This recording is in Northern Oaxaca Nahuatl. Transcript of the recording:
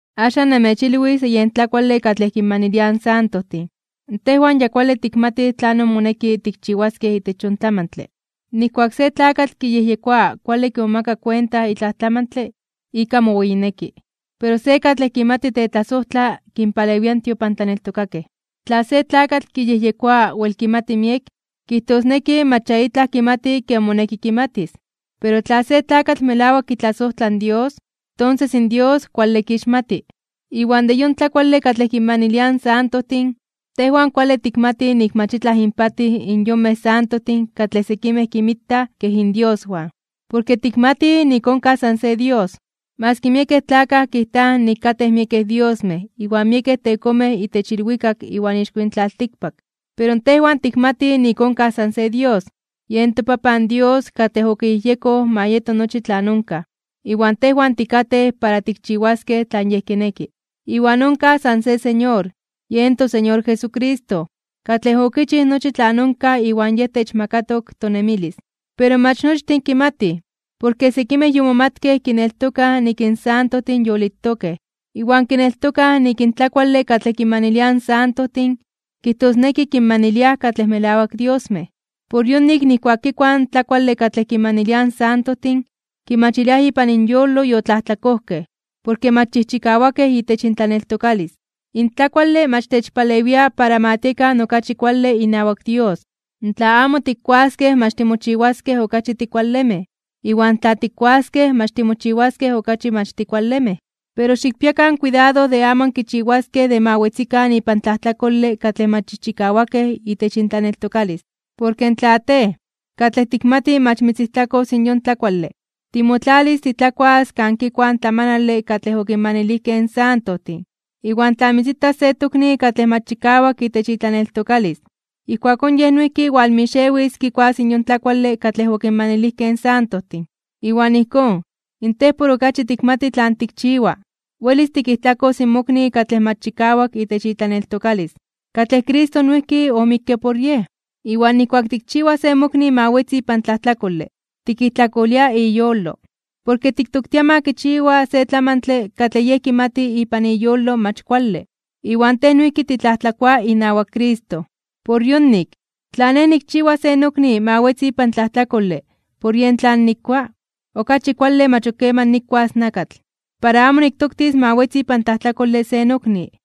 Axan namechilwis de yen tlakuale katlej kinmaniliaj in santojtin. Tejwan ya kuale tikmatij tlanon moneki tikchiwaskej itech yon tlamantle. Nijkuak se tlakatl kiyejyekoa kuale kimomaka kuenta itlaj tlamantle, ika moweyineki. Pero se katlej kimati tetlasojtla, kinpalewia in tiopantlaneltokakej. Tla se tlakatl kiyejyekoa wel kimati miek, kijtosneki mach ya itlaj kimati ken moneki kimatis. Pero tla se tlakatl melawak kitlasojtla in Dios, tonses in Dios kuale kixmati. Iwan de yon tlakuale katlej kinmaniliaj in santojtin, tejwan kuale tikmatij nik mach itlaj inpatij in yonmej santojtin katlej sekimej kinmitaj kej indioswan. Porke tikmatij nik onkaj san se Dios. Maski miekej tlakaj kijtaj nik katej miekej diosmej iwan miekej tekomej itech ilwikak iwan ixko yin tlaltikpak. Pero tejwan tikmatij nik onkaj san se Dios, yen toPapan Dios katlej okiyejyekoj ma yeto nochi tlan onkaj, iwan tejwan tikatej para tikchiwaskej tlan Yej kineki. Iwan onkaj san se Señor, yen toSeñor Jesucristo, katlej okichij nochi tlan onkaj iwan yen techmakatok tonemilis. Pero mach nochtin kimatij. Porke sekimej yomomatkej kineltokaj nik in santojtin yolitokej, iwan kineltokaj nik in tlakuale katlej kinmaniliaj in santojtin, kijtosneki kinmaniliaj katlej melawak diosmej. Por yonik nijkuak kikuaj in tlakuale katlej kinmaniliaj in santojtin, kimachiliaj ipan inyolo yotlajtlakojkej, porke mach chijchikawakej itech intlaneltokalis. In tlakuale mach techpalewia para ma tiekan okachi kuale inawak Dios. Tla amo tikkuaskej mach timochiwaskej okachi tikualemej, iwan tla tikkuaskej mach timochiwaskej okachi mach tikualemej. Pero xikpiakan kuidado de amo ankichiwaskej de ma wetzikan ipan tlajtlakole katlej mach chijchikawakej itech intlaneltokalis. Porke tla tej, katlej tikmati mach mitzijtlakos in yon tlakuale, timotlalis titlakuas kan kikuaj in tlamanale katlej okinmanilijkej in santojtin, iwan tla mitzitas se tokni katlej mach chikawak itech itlaneltokalis, ijkuakón yej noijki walmixewis kikuas yon tlakuale katlej okimanilijkej in santojtin. Iwan ijkón, in tej por okachi tikmati tlan tikchiwa, welis tikijtlakos in mokni katlej mach chikawak itech itlaneltokalis, katlej Cristo noijki omikke por yej. Iwan nijkuak tikchiwa se mokni ma wetzi ipan tlajtlakole, tikijtlakolia iyolo. Porke tiktoktia ma kichiwa se tlamantle tlan yej kimati ipan iyolo mach kuale, iwan tej noijki titlajtlakoa inawak Cristo. Por yonik, tla nej nikchiwa se nokni ma wetzi ipan tlajtlakole por yen tlan nikua, okachi kuale mach ok keman nikuas nakatl, para amo niktoktis ma wetzi ipan tlajtlakole se nokni.